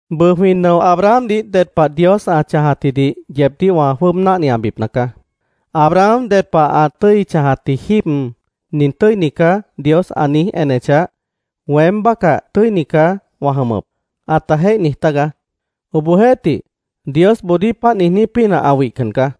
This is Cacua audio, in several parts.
Bʉʉ, jwĩ nʉo Abrahamdih ded pah Dios ã chãjatjidih yeebdíh wã jwʉ́ʉb náhniabipna caá. Abraham ded pah ã tʉ́i chãjatji jíib “Nin tʉ́ini caá”, Dios ã niíj enechah, “Weém bácah tʉ́ini caá wã jʉmʉp”, ãta jéih niij tágaá. Obohjeéhtih, Diosboodíh páant niijní pínah ã wihcan caá.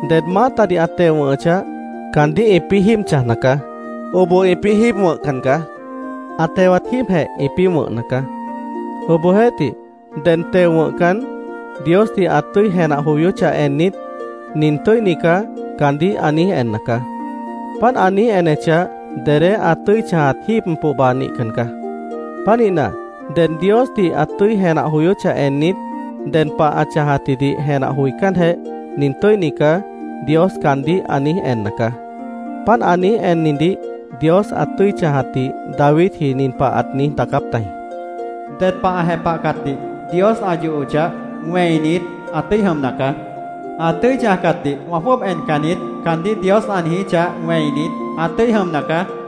Ded maátadih ã teo wʉ̃hʉchah, caandíh ĩpĩ́ jíib chãjna caá. Oboh ĩpĩ́ jíib wʉ̃hcan caá. Ã tewat jíibjeh ĩpĩ́ wʉ̃hna caá. Obohjeéhtih, ded teo wʉ̃hcan, Diosdih ã tʉ́i jenah joyóchah ennit, “Nin tʉ́ini caá”, caandíh ã niíj enna caá. Páant ã niíj enechah, dedé ã tʉ́i chãjat jíib pohba nihcan caá. Pánihna, ded Diosdih ã tʉ́i jenah joyóchah ennit, ded pah ã chãjatjidih jenah joicánjeh, “Nin tʉ́ini caá”, Dios caandíh ã niíj enna caá. Páant ã niíj ennidih Dios ã tʉ́i chãjatdih Davidji nin pah ãt niíj daacáp tajĩ: “Ded ã jepahcatdih Dios ã yohochah, wẽinit, ã tʉ́i jʉmna caá. “Ã tʉ́i chãjcatdih wã jwʉ́ʉb encan niít”, caandíh Dios ã niijíchah, wẽinit, ã tʉ́i jʉmna caá.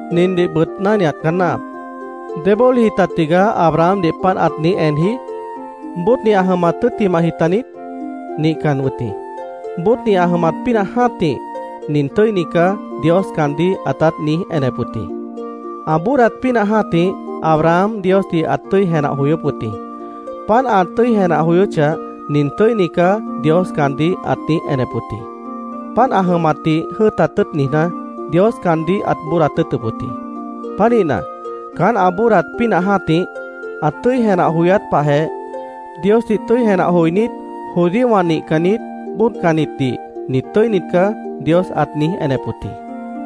Nindihbʉt náhniat caá náahap: ¿Débólihji ta tigaá Abrahamdih páant ãt niíj enji? ¿Bóodni ã jʉmat tʉ́ttimahji taniít? Nihcan wʉt jĩ. Bóodni ã jʉmat pínah jã́tih “Nin tʉ́ini caá”, Dios caandíh ãtát niíj enep wʉt jĩ. Ã bóodat pínah jã́tih Abraham Diosdih ãt tʉ́i jenah joyóp wʉt jĩ. Páant ã tʉ́i jenah joyóchah, “Nin tʉ́ini caá”, Dios caandíh ãt niíj enep wʉt jĩ. Páant ã jʉmatdih jʉ́ʉtat tʉ́ʉt niijná, Dios caandíh ãt bóodat tʉ́ʉtʉp wʉt jĩ. Pánihna, caán ã bóodat pínah jã́tih, ã tʉ́i jenah joyát pahjeh, Diosdih tʉ́i jenah joinít judíowã nihcannit, bóodcannitdih “Nit tʉ́init caá”, Dios ãt niíj enep wʉt jĩ.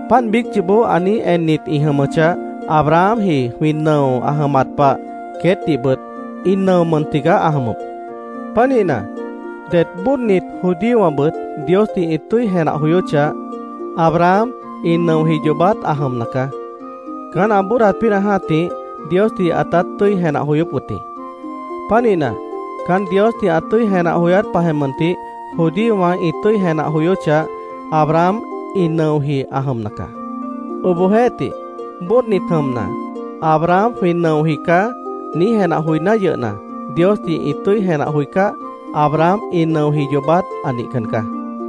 Páant biíc yoobó ã niíj ennit ĩ jʉmʉchah, Abrahamji jwĩ nʉo ã jʉmat pah queétdihbʉt ĩ nʉo mʉn tigaá ã jʉmʉp. Pánihna, det bóodnit judíowãbʉt Diosdih ĩ tʉ́i jenah joyóchah, Abraham ĩ nʉoji yoobát ã jʉmna caá. Caán ã bóodat pínah jã́tih Diosdih ãtát tʉ́i jenah joyóp wʉt jĩ. Pánihna, caán Diosdih ã tʉ́i jenah joyát pahjeh mʉntih, judíowã ĩ tʉ́i jenah joyóchah, Abraham ĩ nʉoji ã jʉmna caá. Obohjeéhtih, bóodnit jʉmna, “Abraham jwĩ nʉoji caá”, niíj jenah joiná yʉhna, Diosdih ĩ tʉ́i jenah joicáh, Abraham ĩ nʉoji yoobát ã nihcan caá.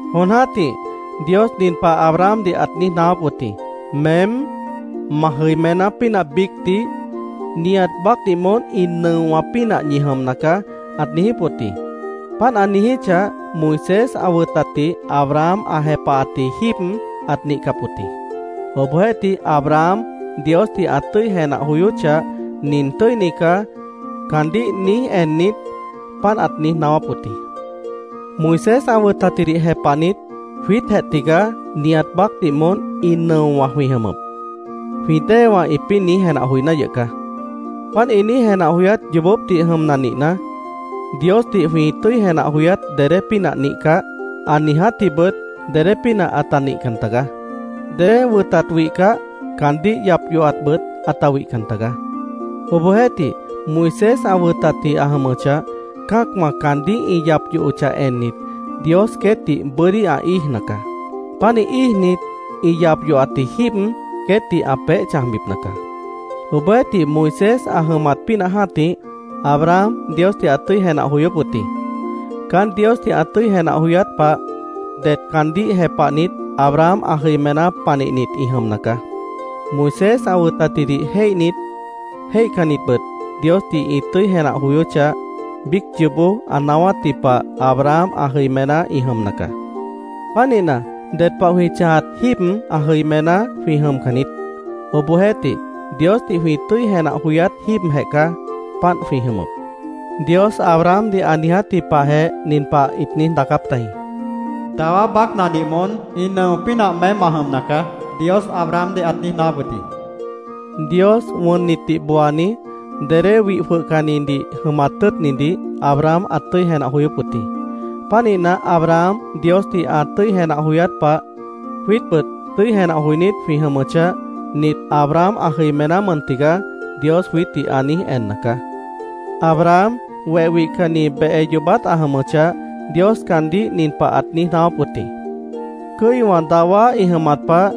Jon jã́tih Dios nin pah Abrahamdih ãt niíj naáwáp wʉt jĩ: “Meém, ma jʉimená pínah biícdih, nihat baácdih moón ĩ nʉowã pínah ñi jʉmna caá”, ãt niijíp wʉt jĩ. Páant ã niijíchah, Moisés ã wʉtatdih Abraham ã jepahatji jíib ãt nihcap wʉt jĩ. Obohjeéhtih, Abraham Diosdih ã tʉ́i jenah joyóchah, “Nin tʉ́ini caá”, caandíh niíj ennit, páant ãt niíj naáwáp wʉt jĩ. “Moisés ã wʉtatjidih jepahnit, jwiítjeh tigaá nihat baácdih moón ĩ nʉowã jwĩ jʉmʉp”, jwĩ déewã ĩpĩ́ niíj jenah joiná yʉh caá. Páant ĩ niíj jenah joyát yoobópdih jʉmna nihna, Diosdih jwĩ tʉ́i jenah joyát dedé pínah nihcah, ã niijátjibʉt dedé pínah ãta nihcan tagaá. Dedé wʉtat wihcah, caandíh yap yohatbʉt ãta wihcan tagaá. Obohjeéhtih, Moisés ã wʉtatji ã jʉmʉchah, cã́acwã caandíh ĩ yap yohochah ennit, Dios queétdih bʉ́dí ã íijna caá. Pánih íijnit, ĩ yap yohatji jíib, queétdih ã peéh chãjbipna caá. Obohjeéhtih, Moisés ã jʉmat pínah jã́tih, Abraham Diosdih ãt tʉ́i jenah joyóp wʉt jĩ. Caán Diosdih ã tʉ́i jenah joyát pah, det caandíh jepahnit Abraham ã jʉimená panihnit ĩ jʉmna caá. Moisés ã wʉtatjidih jéihnit, jéihcannitbʉt Diosdih ĩ tʉ́i jenah joyóchah, biíc yoobó ã naáwátji pah Abraham ã jʉimená ĩ jʉmna caá. Pánihna, ded pah jwĩ chãjat jíib ã jʉimená jwĩ jʉmcan niít. Obohjeéhtih, Diosdih jwĩ tʉ́i jenah joyát jíibjeh caá, páant jwĩ jʉmʉp. Dios Abrahamdih ã niijátji pahjeh nin pah ĩt niíj daacáp tajĩ: “ ‘Dawá baácnadih moón ĩ nʉo pínah meém ma jʉmna caá’, Dios Abrahamdih ãt niíj naáwáp wʉt jĩ”, ĩt niíj daacáp tajĩ. Dios wʉnnitdih booani, dedé wih jwʉhcannidih jʉmat tʉ́ʉtnidih Abraham ãt tʉ́i jenah joyóp wʉt jĩ. Pánihna, Abraham Diosdih ã tʉ́i jenah joyát pah, jwiítbʉt tʉ́i jenah joinít jwĩ jʉmʉchah, “Nit Abraham ã jʉimená mʉn tigaá”, Dios jwiítdih ã niíj enna caá. Abraham weh wihcanni behe yoobát ã jʉmʉchah, Dios caandíh nin pah ãt niíj naáwáp wʉt jĩ: “Cʉ́iwã dawá ĩ jʉmat pah,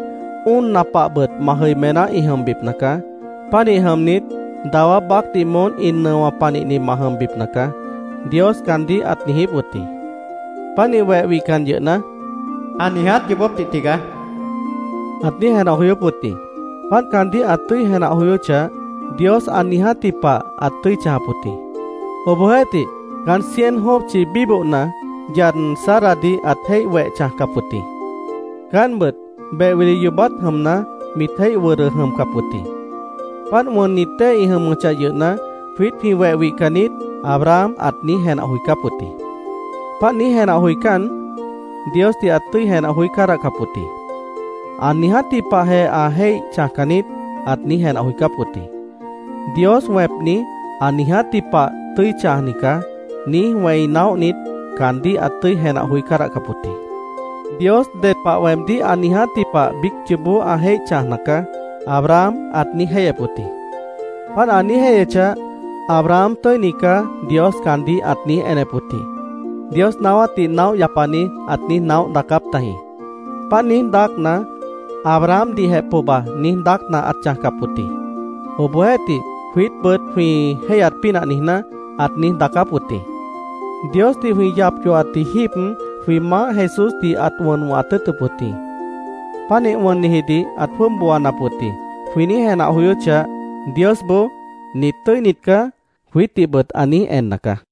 óonna pahbʉt ma jʉimená ĩ jʉmbipna caá. Pánih jʉmnit, dawá baácdih moón ĩ nʉo panihni ma jʉmbipna caá”, Dios caandíh ãt niijíp wʉt jĩ. Pánih weh wihcan yʉhna, “Ã niiját yoobópdih tigaá”, ãt niíj jenah joyóp wʉt jĩ. Páant caandíh ã tʉ́i jenah joyóchah, Dios ã niijátji pah ãt tʉ́i chãjap wʉt jĩ. Obohjeéhtih, caán cien jópchi bíbohna, yad Saradih ãt jéih weh chãjcap wʉt jĩ. Caántbʉt beh wili yoobát jʉmna, mit jéih wʉdʉ jʉmcap wʉt jĩ. Páant wʉnnit dée ĩ jʉmʉchah yʉhna, “Jwiít jwĩ weh wihcan niít”, Abraham ãt niíj jenah joicáp wʉt jĩ. Páant niíj jenah joicán, Diosdih ãt tʉ́i jenah joí cádahcap wʉt jĩ. “Ã niijátji pah ã jéih chãjcan niít”, ãt niíj jenah joicáp wʉt jĩ. “Dios wẽpni, ã niijátji pah tʉ́i chãjni caá”, niíj wẽi naóhnit, caandíh ãt tʉ́i jenah joí cádahcap wʉt jĩ. “Dios ded pah weemdíh ã niijátji pah biíc yoobó ã jéih chãjna caá”, Abraham ãt niíj jéihyep wʉt jĩ. “Páant ã niíj jéihyechah, ‘Abraham tʉ́ini caá’, Dios caandíh ãt niíj enep wʉt jĩ”, Dios naáwátdih naóh yapani ãt niíj naóh daacáp tajĩ. Páant niíj daácna, Abrahamdihjeh pohba niíj daácna ãt chãjcap wʉt jĩ. Obohjeéhtih, jwiítbʉt jwĩ jéihyat pínah niijná, ãt niíj daacáp wʉt jĩ. “Diosdih jwĩ yap yohatji jíib, jwĩ Maáh Jesúsdih ãt wʉn wʉ̃hat tʉ́ʉtʉp wʉt jĩ. Pánih wʉnnijidih ãt jwʉ́ʉb booanap wʉt jĩ”, jwĩ niíj jenah joyóchah, Diosboó “Nit tʉ́init caá”, jwiítdihbʉt ã niíj enna caá.